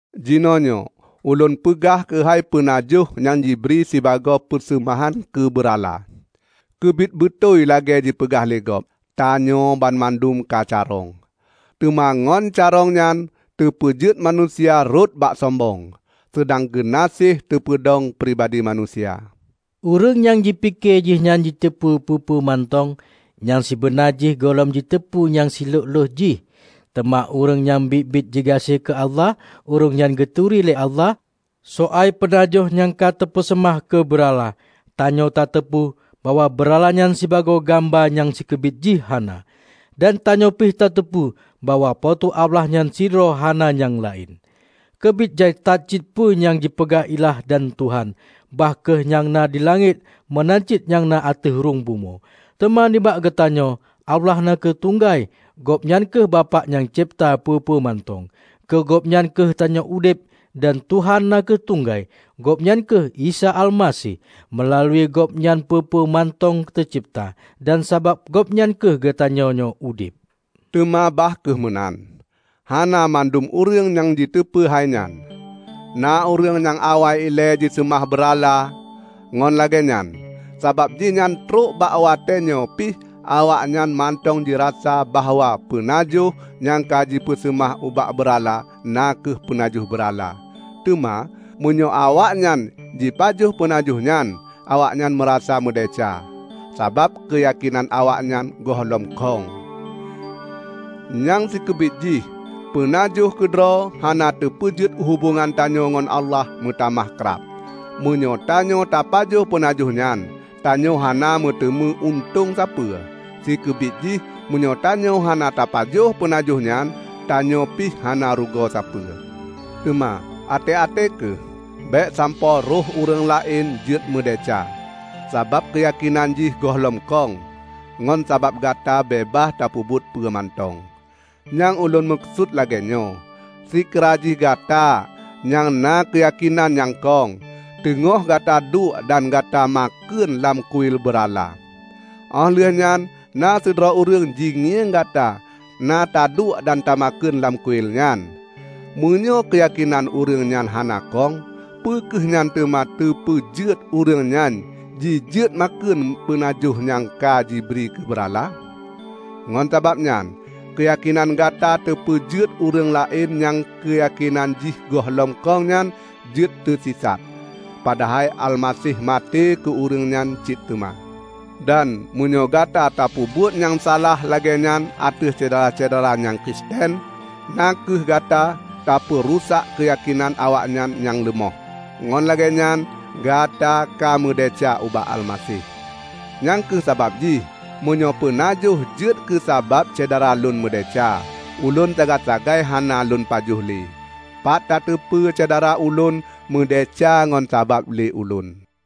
Jinoenyoe ulôn peugah keuhai peunajoh nyang jibri sibagoe peuseumahan keu beurala. Keubiet beutôi lagée jipeugah lé gob, "Tanyoe banmandum ka carông." Teuma ngon carông nyan teupeujeuet manusia rhot bak sombong, seudang geunaséh teupeudong pribadi manusia. Ureuëng nyang jipike jihnyan jiteupeu peue-peue mantong, nyang sibeuna jih gohlom jiteupeu nyang silhok-lhok jih. Teuma ureuëng nyang biet-biet jigaséh keu Allah, ureuëng nyan geuturi lé Allah. Soai peunajoh nyang ka teupeuseumah keu beurala, tanyoe tateupeue bahwa beurala nyan sibagoe gamba nyang sikeubiet jih hana. Dan tanyoe pih tateupeue bahwa Po teu Allah nyan sidroe; hana nyang laén. Keubiet jai that cit peue nyang jipeugah ilah dan tuhan; bah kheueh nyang na dilangét meunan cit nyang na ateueh rhueng bumoe. Teuma nibak geutanyoe, Allah na kheueh tunggai. Gobnyan kheueh Bapak nyang cebta peue-peue mantong. Keu Gobnyan kheueh tanyoe udeb. Dan Tuhan na kheueh tunggai, Gobnyan kheueh Isa Almaseh. Meulalu Gobnyan peue-peue mantong teucebta, dan sabab Gobnyan kheueh geutanyoe nyoe udeb. Teuma bah kheueh meunan, hana mandum ureuëng jiteupeu hainyan. Na ureuëng nyang awai ilée jiseumah beurala. Ngon lagée nyan, sabab jihnyan trok bak watéenyoe pih awaknyan mantong jirasa bahwa peunajoh, nyang ka jipeuseumah ubak beurala, na kheueh peunajoh beurala. Teuma, meunyoe awaknyan jipajoh peunajoh nyan, awaknyan meurasa meudesya; sabab keuyakénan awaknyan gohlom khong. Nyang sikeubit jih peunajoh keudroe hana teupeujeuet hubongan tanyoe ngon Allah meutamah krab. Meunyoe tanyoe tapajoh peunajoh nyan, tanyoe hana meuteumé untông sapeue. Sikeubit jih, meunyoe tanyoe hana tapajoh peunajoh nyan, tanyoe pih hana rugoe sapeue. Teuma, até-até kheueh! Bék sampoe rôh ureuëng laén jeuet meudesya -- sabab keuyakénan jih gohlom khong -- ngon sabab Gata beubaih tapeubuet peue mantong. Nyang ulôn meukeusut lagée nyoe: Seukira jih Gata, nyang na keuyakénan nyang khong, teungoh gata duek dan gata makheun lam kuil beurala. Óh lheueh nyan na sidroe ureuëng jingieng Gata na taduek dan tamakheun lam kuil nyan. Meunyoe keuyakénan ureuëng nyan hana khong, peu kheueh nyan teuma teupeujeuet ureuëng nyan jijeuet makheun peunajoh nyang ka jibri keu beurala? Ngon sabab nyan, keuyakénan Gata teupeujeuet ureuëng laén nyang keuyakénan jih gohlom khong nyan jeuet keusisat. Padahai Almaseh maté keu ureuëng nyan cit teuma. Dan meunyoe Gata tapeubuet nyang salah lagée nyan ateueh syedara-syedara nyang Kristen -- na kheueh Gata katapeurusak keuyakénan awaknyan nyang leumoh -- ngon lagée nyan Gata ka meudesya ubak Almaseh. Nyang kheueh sabab jih, meunyoe peunajoh jeuet keusabab syedara lôn meudesya, ulôn sagai-sagai hana lôn pajoh le. Pat tateupeue syedara ulôn meudesya ngon sabab lé ulôn.